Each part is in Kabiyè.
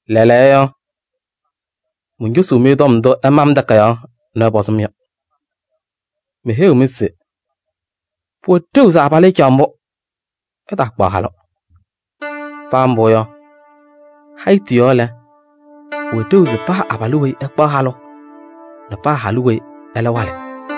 Lɛɛlɛɛyɔ, moncosuu-mɩ tɔm ndʋ ɩma-m takayaɣ nɛ ɩpɔzɩ-m yɔ. Meheyiɣ-mɩ se: pʋwɛ ɖeu se abalʋ ɛcaɣ mbʋ, ɛtaakpaɣ halʋ. Paa mbʋ yɔ, hayitu yɔɔ lɛ, pʋwɛ ɖeu se paa abalʋ weyi ɛkpaɣ halʋ nɛ paa halʋ weyi ɛlɛ walɩ.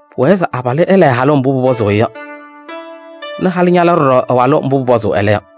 Pʋwɛɛ se abalʋ ɛla ɛ-halʋ mbʋ pʋpɔzʋʋ-ɩ yɔ nɛ halʋ ñala ɖɔɖɔ ɛ-walʋ mbʋ pʋpɔzʋʋ ɛlɛ yɔ.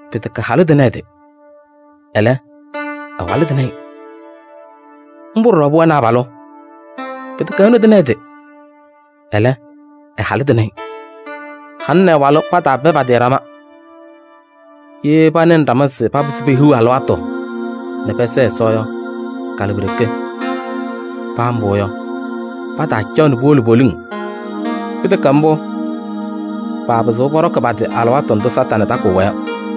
Pɩtɛkɛ halʋ tɩnɩ ɛ-tɩ, ɛlɛ, ɛ-walʋ tɩnɩ-ɩ. Mbʋ ɖɔɖɔ pʋwɛnɩ abalʋ. Pɩtɛkɛ ɛnʋ tɩnɩ ɛ-tɩ, ɛlɛ, ɛ-halʋ tɩnɩ-ɩ. Halʋ nɛ ɛ-walʋ pataapɛ pa-tɩ ɖama. Ye panɩnɩ ɖama se papɩzɩ pehiɣ alɩwaatʋ nɛ pɛsɛɛ Ɛsɔ yɔ, kalɩ pi-ɖeke. Paa mbʋ yɔ, pataacaɣ nɛ puwolo poliŋ. Pɩtɛkɛ mbʋ, paapɩzɩɣ pɔɖɔkɩ pa-tɩ alɩwaatʋ ndʋ Satanɩ takɩɣ-wɛ yɔ.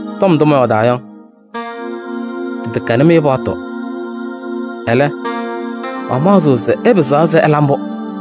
Ndʋ mɔyɔɔdaa yɔ, tɩtɛkɛnɩ-mɩ paɣtʋ. Ɛlɛ, mamaɣzɩɣ se ɩpɩzaɣ se ɩla mbʋ.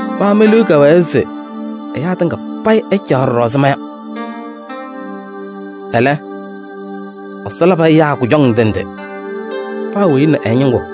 Ma me-liu kɛwɛɛ se ɛyaa tɩŋa payɩ ɛcaɣ mbʋ ɛzɩ ma yɔ. Ɛlɛ, Ɛsɔ labɩ ɛyaa kʋjɔŋ ndɩ ndɩ. Paa weyi ɛ nɛ ɛ-ñɩŋgʋ.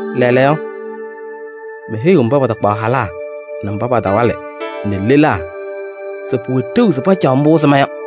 Lɛɛlɛɛyɔ, meheyiɣ mba patakpaɣ halaa nɛ mba patawalɩ nɛ lelaa se pʋwɛ ɖeu se pacaɣ mbʋ ɛzɩ ma yɔ.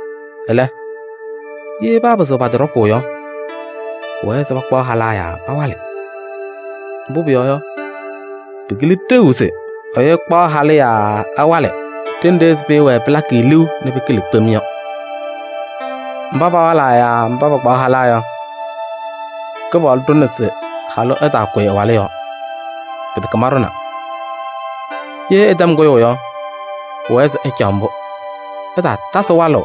Ɛlɛ, ye paapɩzɩɣ pa-tɩ ɖɔkʋʋ yɔ, pʋwɛɛ se pakpaɣ halaa yaa pawalɩ. Mbʋ pʋyɔɔ yɔ, pɩkɩlɩ ɖeu se ɛyʋ ɛkpaɣ halʋ yaa ɛwalɩ ɖenɖe ɛzɩ pɩɩwɛɛ pɩlakɩ-ɩ liu nɛ pɩkɩlɩ kpem yɔ. Mba pawalaa yaa pakpaɣ halaa yɔ, Kɩpaɣlʋ ɖʋna se halʋ ɛtaakʋyɩ ɛ-walʋ yɔɔ. Pɩtɛkɛ maɖʋna. Ye ɛtɛm kʋyʋʋ yɔ, pʋwɛɛ se ɛcaɣ mbʋ. Ɛtaatasɩ walʋʋ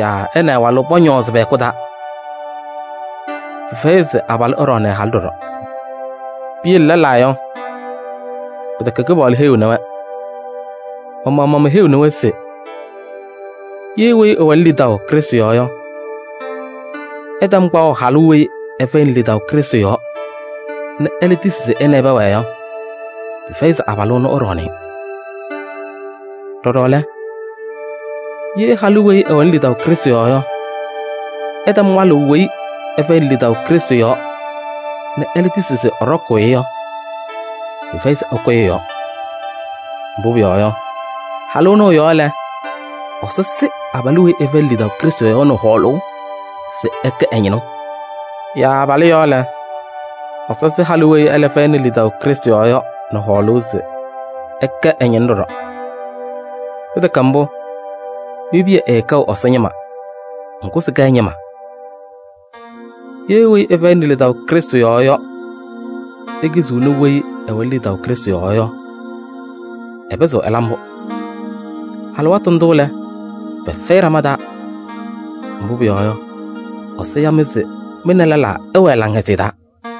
yaa ɛ nɛ ɛ-walʋ pɔñɔɔzɩ pɛ-hɛkʋ taa. Pɩfɛyɩ se abalʋ ɛɖɔɔnɩ ɛ-halʋ ɖɔɖɔ. Piyele lɛlaa yɔ, pɩtɛkɛ Kɩpaɣlʋ heyiɣni-wɛ. Ma-maɣmaɣ meheyiɣnɩ-wɛ se: ye weyi ɛwɛnɩ lidaʋ Krɩstʋ yɔɔ yɔ ɛtɛm kpaɣʋ halʋ weyi ɛfɛyɩnɩ lidaʋ Krɩstʋ yɔɔ nɛ ɛlɛ tisi se ɛ nɛ ɩ pɛwɛɛ yɔ, pɩfɛyɩ se abalʋ ɛnʋ ɛɖɔɔnɩ-ɩ. Ɖɔɖɔ lɛ, ye halʋ weyi ɛwɛnɩ lidaʋ Krɩstʋ yɔɔ yɔ ɛtɛm walʋʋ weyi ɛfɛyɩnɩ lidaʋ Krɩstʋ yɔɔ nɛ ɛlɛ tisi se ɛɖɔkʋʋ-ɩ yɔ, pɩfɛyɩ se ɛkʋyɩ ɛ-yɔɔ. Mbʋ pʋyɔɔ yɔ, halʋ ɛnʋ ɛ-yɔɔ lɛ, Ɛsɔ sɩ abalʋ weyi ɛfɛyɩnɩ lidaʋ Krɩstʋ yɔɔ yɔ nɛ hɔɔlʋʋ se ɛkɛ ɛ-ñɩnʋ. Yaa abalʋ yɔɔ lɛ, Ɛsɔ sɩ halʋ weyi ɛlɛ fɛyɩnɩ lidaʋ Krɩstʋ yɔɔ yɔ nɛ hɔɔlʋʋ se ɛkɛ ɛ-ñɩnʋ ɖɔɖɔ. Pɩtɛkɛ mbʋ, mi-piya ɛɛkɛɣ Ɛsɔ ñɩma, ŋgʋ sɩkɛ ɛ-ñɩma. Ye weyi ɛfɛyɩnɩ lidaʋ Krɩstʋ yɔɔ yɔ, ekiziɣni weyi ɛwɛnɩ lidaʋ Krɩstʋ yɔɔ yɔ, ɛpɩzɩɣ ɛla mbʋ. Alɩwaatʋ ndʋ lɛ, pɛfɛyɩ ɖama taa. Mbʋ pʋyɔɔ yɔ, Ɛsɔ ya-mɩ se mɩ nɛ lɛlaa ɩwɛɛ laŋhɛzɩyɛ taa.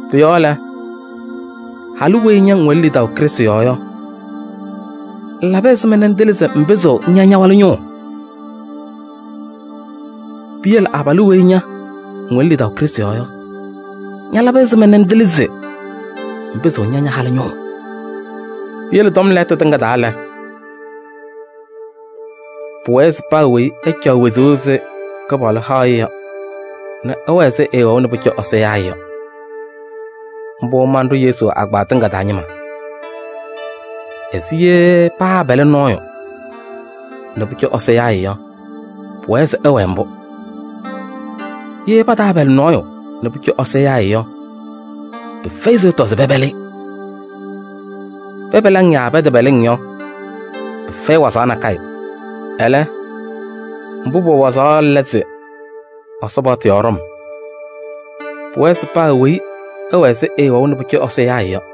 Pʋ-yɔɔ lɛ, halʋ weyi ña ŋwɛnɩ lidaʋ Krɩstʋ yɔɔ yɔ, ŋlabɩ ɛzɩma ŋtɩlɩ se ŋpɩzɩɣ ŋya ña-walʋ ñʋʋ? Piyele abalʋ weyi ña ŋwɛnɩ lidaʋ Krɩstʋ yɔɔ yɔ, ñalabɩ ɛzɩma ŋtɩlɩ se ŋpɩzɩɣ ŋya ña-halʋ ñʋʋ? Piyele tɔm lɛɛtʋ tɩŋa payɩ taa lɛ, pʋwɛɛ se paa weyi ɛcaɣ wezuu ɛzɩ Kɩpaɣlʋ haʋ-ɩ yɔ nɛ ɛwɛɛ ɛzɩ ɛɛwɛʋ nɛ pʋcɔ Ɛsɔ yaa-ɩ yɔ. Mbʋ manɖʋ Yesu agbaa tɩŋa taa ñɩma. Ɛzɩ ye paapɛlɩ nɔɔyʋ nɛ pʋcɔ Ɛsɔ yaa-ɩ yɔ, pʋwɛɛ se ɛwɛɛ mbʋ. Ye pataapɛlɩ nɔɔyʋ nɛ pʋcɔ Ɛsɔ yaa-ɩ yɔ, pɩfɛyɩ se ɛtɔ se pɛpɛlɩ-ɩ. Pɛpɛlɩ-ŋ yaa pɛtɛpɛlɩ-ŋ yɔ, pɩfɛyɩ wazaɣ nakɛyɛ. Ɛlɛ, mbʋ pʋwɛ wazaɣ yɔ lɛ Ɛsɔ paɣtʋ yɔɔ ɖɔm. Pʋwɛɛ se paa weyi ɛwɛɛ ɛzɩ ɛɛwɛʋ nɛ pʋcɔ Ɛsɔ yaa-ɩ yɔ.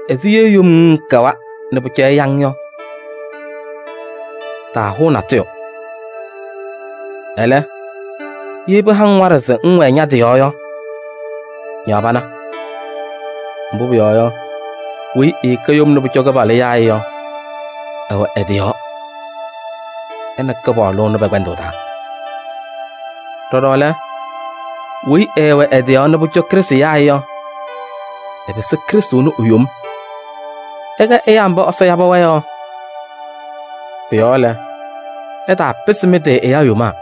Ɛzɩ ye yom ŋŋkɛwa nɛ pʋcɔ ɛya-ŋ yɔ, taahʋʋ natʋyʋ. Ɛlɛ, ye pɩha-ŋ waɖɛ se ŋwɛɛ ña-tɩ yɔɔ yɔ, ñaɣ pana. Mbʋ pʋyɔɔ yɔ, weyi ɛɛkɛ yom nɛ pʋcɔ Kɩpaɣlʋ yaa-ɩ yɔ, ɛwɛ ɛ-tɩ yɔɔ ɛ nɛ Kɩpaɣlʋ ɛnʋ pɛ-kpɛndʋʋ taa. Ɖɔɖɔ lɛ, weyi ɛɛwɛ ɛ-tɩ yɔɔ nɛ pʋcɔ Krɩstʋ yaa-ɩ yɔ, ɛpɩsɩ Krɩstʋ ɛnʋ e-yom. Ɩkɛ ɛyaa mba Ɛsɔ yabɩ-wɛ yɔ. Pʋ-yɔɔ lɛ, ɩtaapɩsɩ mɩ-tɩ ɛyaa yomaa.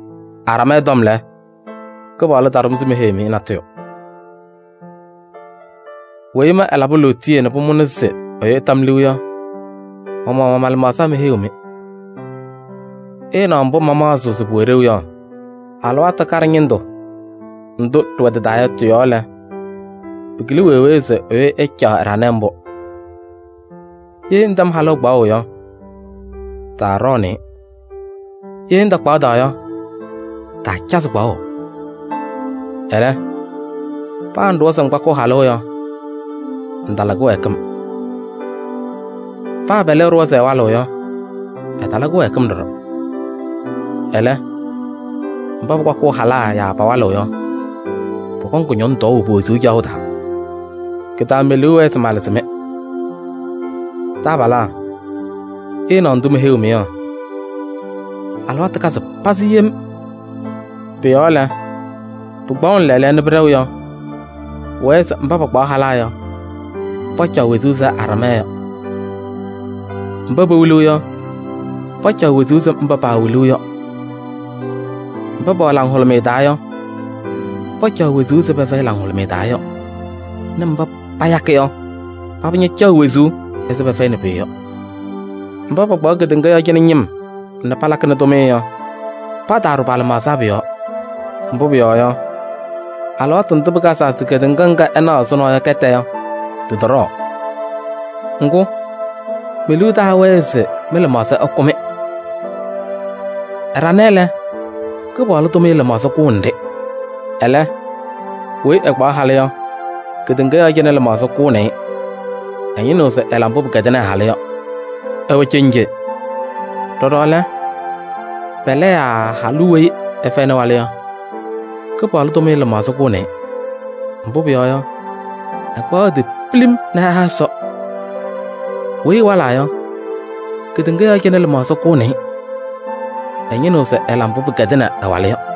Aɖamɛɛ tɔm lɛ, Kɩpaɣlʋ taɖʋ-m se meheyi-mɩ natʋyʋ. Weyi ma ɛlabɩ lootiye nɛ pʋmʋna se ɛyʋ ɛta-m liu yɔ, ma-maɣmaɣ ma-lɩmaɣza meheyiɣ-mɩ. Ɩɩnaɣ mbʋ mamaɣzɩɣ se pʋwɛ ɖeu yɔ: alɩwaatʋ kaɖɛ ñɩndʋ ndʋ ɖɩwɛ tɩ-taa lɛɛlɛɛyɔ yɔ tɩ-yɔɔ lɛ, pɩkɩlɩ wee wee se ɛyʋ ɛcaɣ ɛɖanɛ mbʋ. Ye ŋtɛm halʋ kpaɣʋ yɔ, taaɖɔɔnɩ-ɩ. Ye ŋtakpaɣda yɔ, taacazɩ kpaɣʋ. Ɛlɛ, paa ŋɖʋwa se ŋkpakɩɣ halʋ yɔ, ŋtala kɩwɛɛkɩm. Paa pɛlɛ ɛɖʋwa se ɛwalɩɣ yɔ, ɛtala kɩwɛɛkɩm ɖɔɖɔ. Ɛlɛ, mba pakpakɩɣ halaa yaa pawalɩɣ yɔ, pɔkɔŋ tɔɔʋ kʋñɔŋ pe-wezuu caɣʋ taa. Kɩ-taa me-liu wɛɛ se malɩzɩ-mɩ. Taabalaa, ɩɩnaɣ ndʋ meheyiɣ-mɩ yɔ: alɩwaatʋ kazɩ pazɩ yem. Pʋ-yɔɔ lɛ, pɩkpaɣʋnɩ lɛɛlɛɛyɔ nɛ pɩɖɛɣ yɔ, pʋwɛɛ se mba pakpaɣ halaa yɔ, pacaɣ wezuu ɛzɩ aɖamɛɛ yɔ. Mba pewiliɣ yɔ, pacaɣ wezuu ɛzɩ paawiliɣ yɔ. Mba pɛwɛ laŋhʋlʋmɩyɛ taa yɔ, pacaɣ wezuu ɛzɩ pɛfɛyɩ laŋhʋlʋmɩyɛ taa yɔ nɛ mba payakɩ yɔ, paba ñacaɣ wezuu ɛzɩ pɛfɛyɩnɩ pʋyʋ yɔ. Mba pakpaɣ kedeŋa yɔɔ cɩnɛ ñɩm nɛ palakɩnɩ tʋmɩyɛ yɔ, pataaɖʋ pa-lɩmaɣza pʋ-yɔɔ. Mbʋ pʋyɔɔ yɔ, alɩwaatʋ ndʋ pɩkazaa se kedeŋa ŋga ɩnaɣ ɛzʋnɔ yɔ kɛtɛ yɔ, tɩtɔɖɔɔ. Ŋgʋ, me-liu taawɛɛ se mɩ-lɩmaɣza ɛkʋ-mɩ. Ɛɖanɛ lɛ, Kɩpaɣlʋ tʋmɩyɛ lɩmaɣza kʋʋnɩ-ɖɩ. Ɛlɛ, weyi ɛkpaɣ halʋ yɔ, kedeŋa yɔɔ cɩnɛ lɩmaɣza kʋʋnɩ-ɩ. Ɛñɩnɩɣ se ɛla mbʋ pɩkɛdɩnɩ ɛ-halʋ yɔ. Ɛwɛ cenje. Ɖɔɖɔ lɛ, pɛlɛ yaa halʋ weyi ɛfɛyɩnɩ walʋ yɔ, Kɩpaɣlʋ tʋmɩyɛ lɩmaɣza kʋʋnɩ-ɩ. Mbʋ pʋyɔɔ yɔ, ɛkpaɣ ɛ-tɩ pilim nɛ ɛha Ɛsɔ. Weyi ɛwalaa yɔ, kedeŋa yɔɔ cɩnɛ lɩmaɣza kʋʋnɩ-ɩ. Ɛñɩnɩɣ se ɛla mbʋ pɩkɛdɩnɩ ɛ-walʋ yɔ.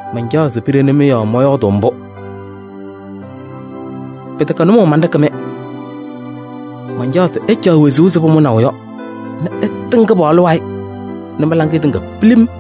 Mancaɣ se piɖeni-mɩ yɔɔ mɔyɔɔdʋʋ mbʋ. Pɩtɛkɛ nʋmɔʋ manɖɩkɩ-mɩ. Mancaɣ se ɩcaɣ wezuu ɛzɩ pʋmʋnaʋ yɔ nɛ ɩtɩŋ Kɩpaɣlʋ wayɩ nɛ mɩ-laŋɩyɛ tɩŋa pilim.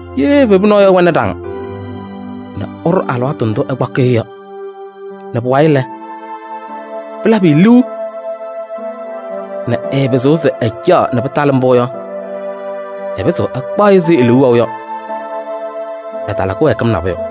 Ye evebu nɔɔyʋ ɛwɛnɩ ɖaŋ nɛ ɛɖʋ alɩwaatʋ ndʋ ɛkpakɩɣ-ɩ yɔ, nɛ pʋwayɩ ɛlabɩ-ɩ liu nɛ ɛɛpɩzɩɣ se ɛcaɣ nɛ pɩtalɩ mbʋ yɔ, ɛpɩzɩɣ ɛkpaɣ-ɩ ɛzɩ e-liu wɛʋ yɔ: ɛtala kɩwɛɛkɩm nabʋyʋ.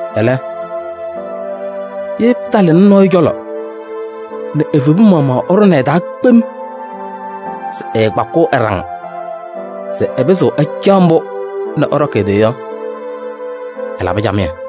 Ɛlɛ, ye pɩtalɩnɩ nɔɔyʋ cɔlɔ nɛ evebu maɣmaɣ ɛɖʋnɩ ɛ-taa kpem se ɛɛkpakɩɣ ɛ-ɖaŋ se ɛpɩzɩɣ ɛcaɣ mbʋ nɛ ɛɖɔkɩ ɛ-tɩ yɔ, ɛlabɩ camɩyɛ.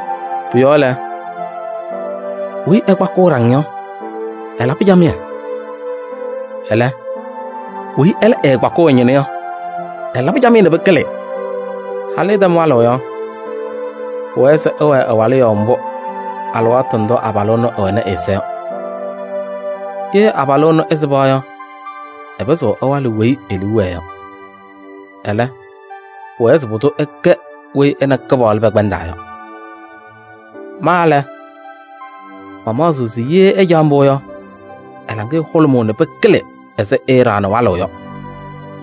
Pʋ-yɔɔ lɛ, weyi ɛkpakɩɣ ɛ-ɖaŋ yɔ, ɛlabɩ camɩyɛ. Ɛlɛ, weyi ɛɛkpakɩɣ ɛ-ñɩnʋ yɔ, ɛlabɩ camɩyɛ nɛ pɩkɩlɩ. Halʋ ɛtɛm walʋʋ abalʋ yɔ, pʋwɛɛ se ɛwɛɛ ɛ-yɔɔ mbʋ alɩwaatʋ ndʋ abalʋ ɛnʋ ɛwɛnɩ ɛ-ɛza yɔ. Ye abalʋ ɛnʋ ɛsɩba yɔ, ɛpɩzɩɣ ɛwalɩ weyi e-liu wɛɛ yɔ. Ɛlɛ, pʋwɛɛ se pʋdʋ ɛkɛ weyi ɛ nɛ Kɩpaɣlʋ pɛkpɛndaa yɔ. Ma lɛ, mamaɣzɩɣ se ye ɛcaɣ mbʋ yɔ, ɛ-laŋɩyɛ hʋlʋmʋʋ nɛ pɩkɩlɩ ɛzɩ ɛɛɖaɣnɩ walʋʋ yɔ.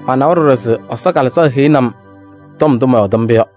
Manawa ɖɔɖɔ se Ɛsɔ Kalɩzaɣ heyini-m ndʋ mɔyɔɔdɩ mbʋ yɔ.